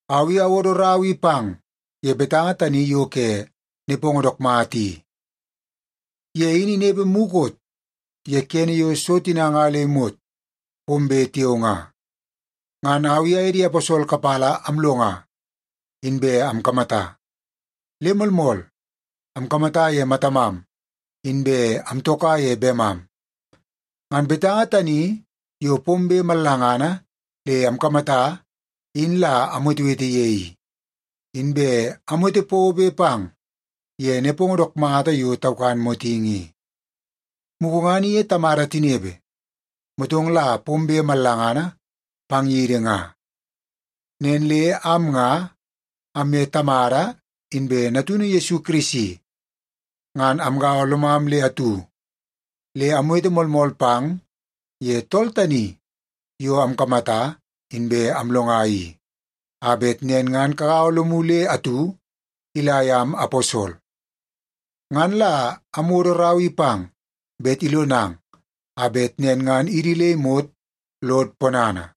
Au i awodo rau i pang ye Betanga tani yo ke nepongo dook mata i. Ye in inepe mukot ye kene yo so tina nga le imot pombe tiao nga. Ngan au i aye di aposol kapala amlonga, inbe amkamata. Le moolmool, amkamata ye matamam inbe amtoka ye bemam. Ngan Betanga tani yo pombe mallangana le amkamata in la amwetewete ye i, inbe amwete pobe pang ye nepongo dook mata yo taukan motingi i. Mugu ngan iye Tamada tinepe, motong la pombe mallangana pang yidi nga. Nen le am nga amye Tamada inbe Natunu Yesu Kirisi ngan amgaua lomam le atu. Le amwete moolmool pang ye Tool tani yo amkamata inbe amlonga i, a bet nen ngan kagaua lomu le atu ila yam aposol. Ngan la amwodo rau i pang bet ilonang a bet nen ngan idi le imot lod ponana.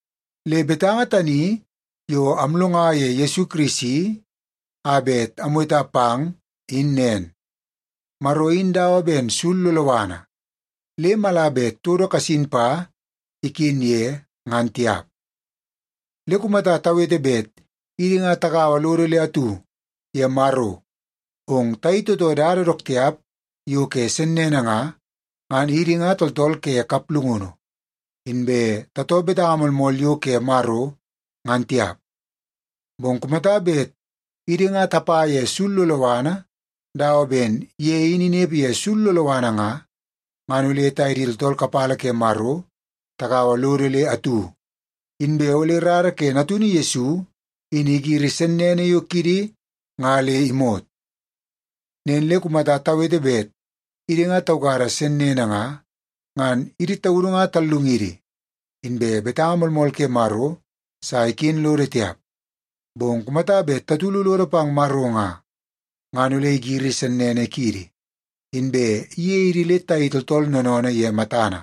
Le betanga tani yo amlonga ye Yesu Kirisi a bet amweta pang in nen: Maro in dawa ben sul loloana, le mala bet todo kasin pa iken ye, ngan tiap. Le kumata tawete bet idi nga tagaua lodo le atu ye Maro, bong tayei tootoo dada dook tiap yo ke sennene nga, ngan idi nga tooltool ke kaplungunu, inbe tatoo betanga moolmool yo ke Maro, ngan tiap. Bong kumata bet idi nga tapa ye sul loloana dawa ben ye in inepe ye sul loloana nga, ngan ole taye di tooltool kapala ke Maro tagaua lodo le atu, inbe ole rara ke Natunu Yesu in igiri sennene yo kiidi nga le imot. Nen le kumata tawete bet idi nga taukada sennene nga, ngan idi taudu nga tallungidi, inbe betanga moolmool ke Maro sa iken lodo tiap. Bong kumata bet tatulu lodo pang Maro nga, ngan ole igiri sennene kiidi, inbe iyei idi le tayei tooltool noonoonoo ye matana.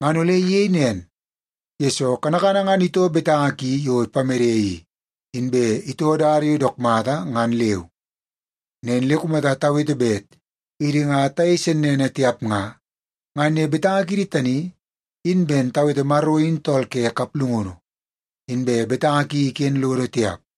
Ngan ole iyei nen, yesoo kanakana ngan itoo betanga ki yo ipamede i, inbe itoo dada yo dook mata ngan leu. Nen le kumata tawete bet idi nga tayei sennene tiap nga, ngan ye betanga kiidi tani in ben tawete Maro in tool ke kaplungunu, inbe betanga ki iken lodo tiap.